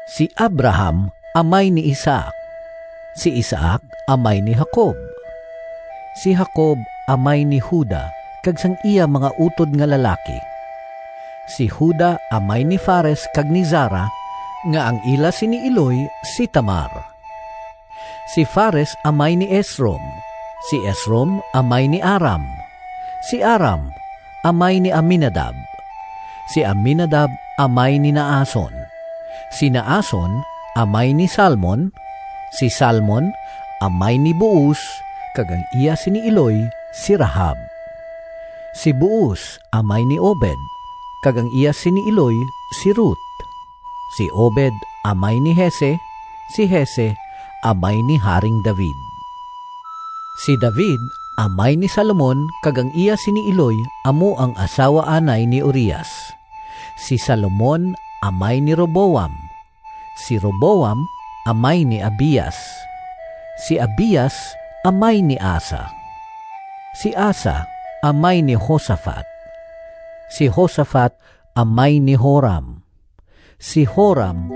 Si Abraham amay ni Isaac; si Isaac amay ni Jacob; si Jacob amay ni Juda kag sang iya mga utod nga lalaki. Si Juda amay ni Fares kag ni Zara nga ang ila sini iloy si Tamar. Si Fares amay ni Esrom; si Esrom amay ni Aram. Si Aram amay ni Aminadab; si Aminadab amay ni Naason; si Naason amay ni Salmon; si Salmon amay ni Booz kag ang iya sini iloy si Rahab. Si Booz amay ni Obed kag ang iya sini iloy si Rut. Si Obed amay ni Jese; si Jese amay ni Haring David. Si David amay ni Salomon kag ang iya sini iloy amo ang asawa anay ni Urias; si Salomon amay ni Roboam; si Roboam amay ni Abias; si Abias amay ni Asa; si Asa amay ni Josafat; si Josafat amay ni Joram; si Joram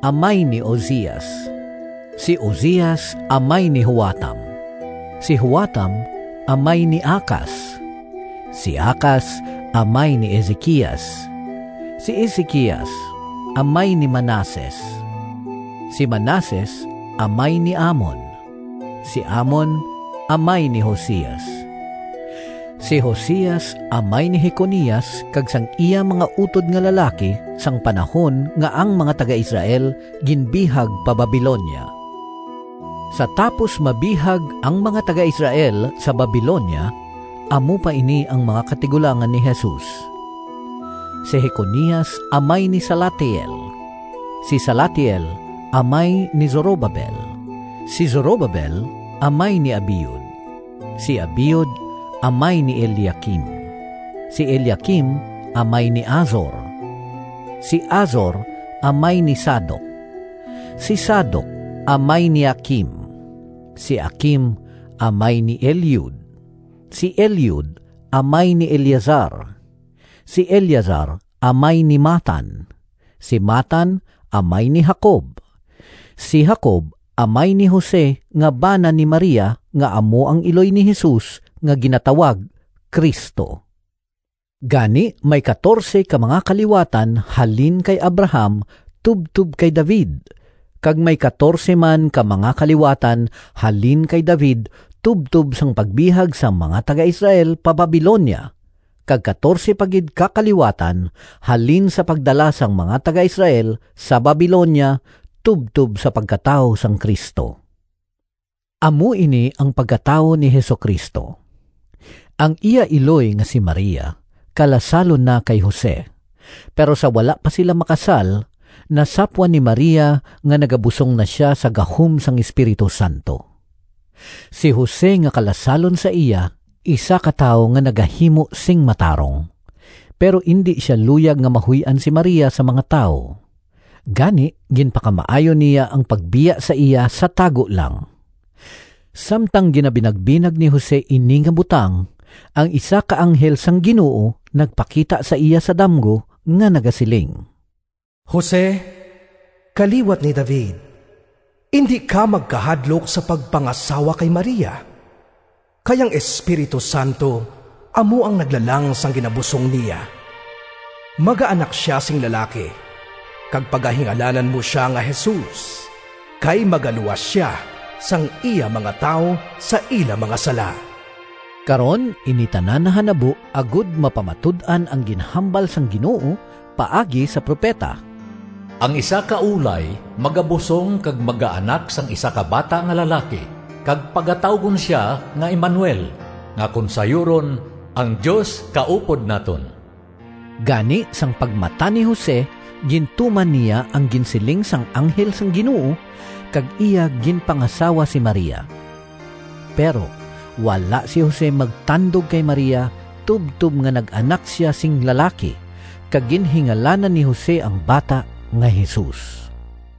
amay ni Ozias; si Ozias amay ni Joatam; si Joatam amay ni Acas; si Acas amay ni Ezequias. Si Ezequias amay ni Manases; si Manases amay ni Amon; si Amon amay ni Josias; si Josias amay ni Jeconias kag sang iya mga utod nga lalaki, sang panahon nga ang mga taga-Israel ginbihag pa Babilonia. Sa tapos mabihag ang mga taga-Israel sa Babilonia, amo pa ini ang mga katigulangan ni Jesus: si Jeconias amay ni Salatiel; si Salatiel amay ni Zorobabel; si Zorobabel amay ni Abiud; si Abiud amay ni Eliaquim; si Eliaquim amay ni Azor; si Azor amay ni Sadoc; si Sadoc amay ni Aquim; si Aquim amay ni Eliud; si Eliud amay ni Eleazar; si Eleazar amay ni Matan; si Matan amay ni Jacob; si Jacob amay ni Jose, nga bana ni Maria nga amo ang iloy ni Jesus nga ginatawag Cristo. Gani may katorse ka mga kaliwatan halin kay Abraham tubtob kay David, kag may katorse man ka mga kaliwatan halin kay David tubtob sang pagbihag sang mga taga-Israel pa Babilonia, kag katorse pa gid ka kaliwatan halin sa pagdala sang mga taga-Israel sa Babilonia tubtob sa pagkatawo sang Cristo. Amo ini ang pagkatawo ni Jesu-Cristo. Ang iya iloy nga si Maria kalasalon na kay Jose, pero sa wala pa sila makasal nasapwan ni Maria nga nagabusong na sia sa gahom sang Espiritu Santo. Si Jose nga kalasalon sa iya isa ka tawo nga nagahimo sing matarong, pero indi sia luyag nga mahuy-an si Maria sa mga tawo. Gani ginpakamaayo niya ang pagbiya sa iya sa tago lang. Samtang ginabinagbinag ni Jose ini nga butang, ang isa ka anghel sang Ginoo nagpakita sa iya sa damgo nga nagasiling, “Jose, kaliwat ni David, indi ka magkahadlok sa pagpangasawa kay Maria, kay ang Espiritu Santo amo ang naglalang sang ginabusong niya. Magaanak sia sing lalaki, kag pagahingalanan mo sia nga Jesus, kay magaluwas sia sang iya mga tawo sa ila mga sala.” Karon ini tanan nahanabo agod mapamatud-an ang ginhambal sang Ginoo paagi sa propeta, “Ang isa ka ulay magabusong kag magaanak sang isa ka bata nga lalaki, kag pagatawgon sia nga Emanuel” (nga kon sayuron, “Ang Dios kaupod naton”). Gani sang pagmata ni Jose gintuman niya ang ginsiling sang anghel sang Ginoo, kag iya ginpangasawa si Maria. Pero wala si Jose magtandog kay Maria tubtob nga nag-anak sia sing lalaki, kag ginhingalanan ni Jose ang bata nga Jesus.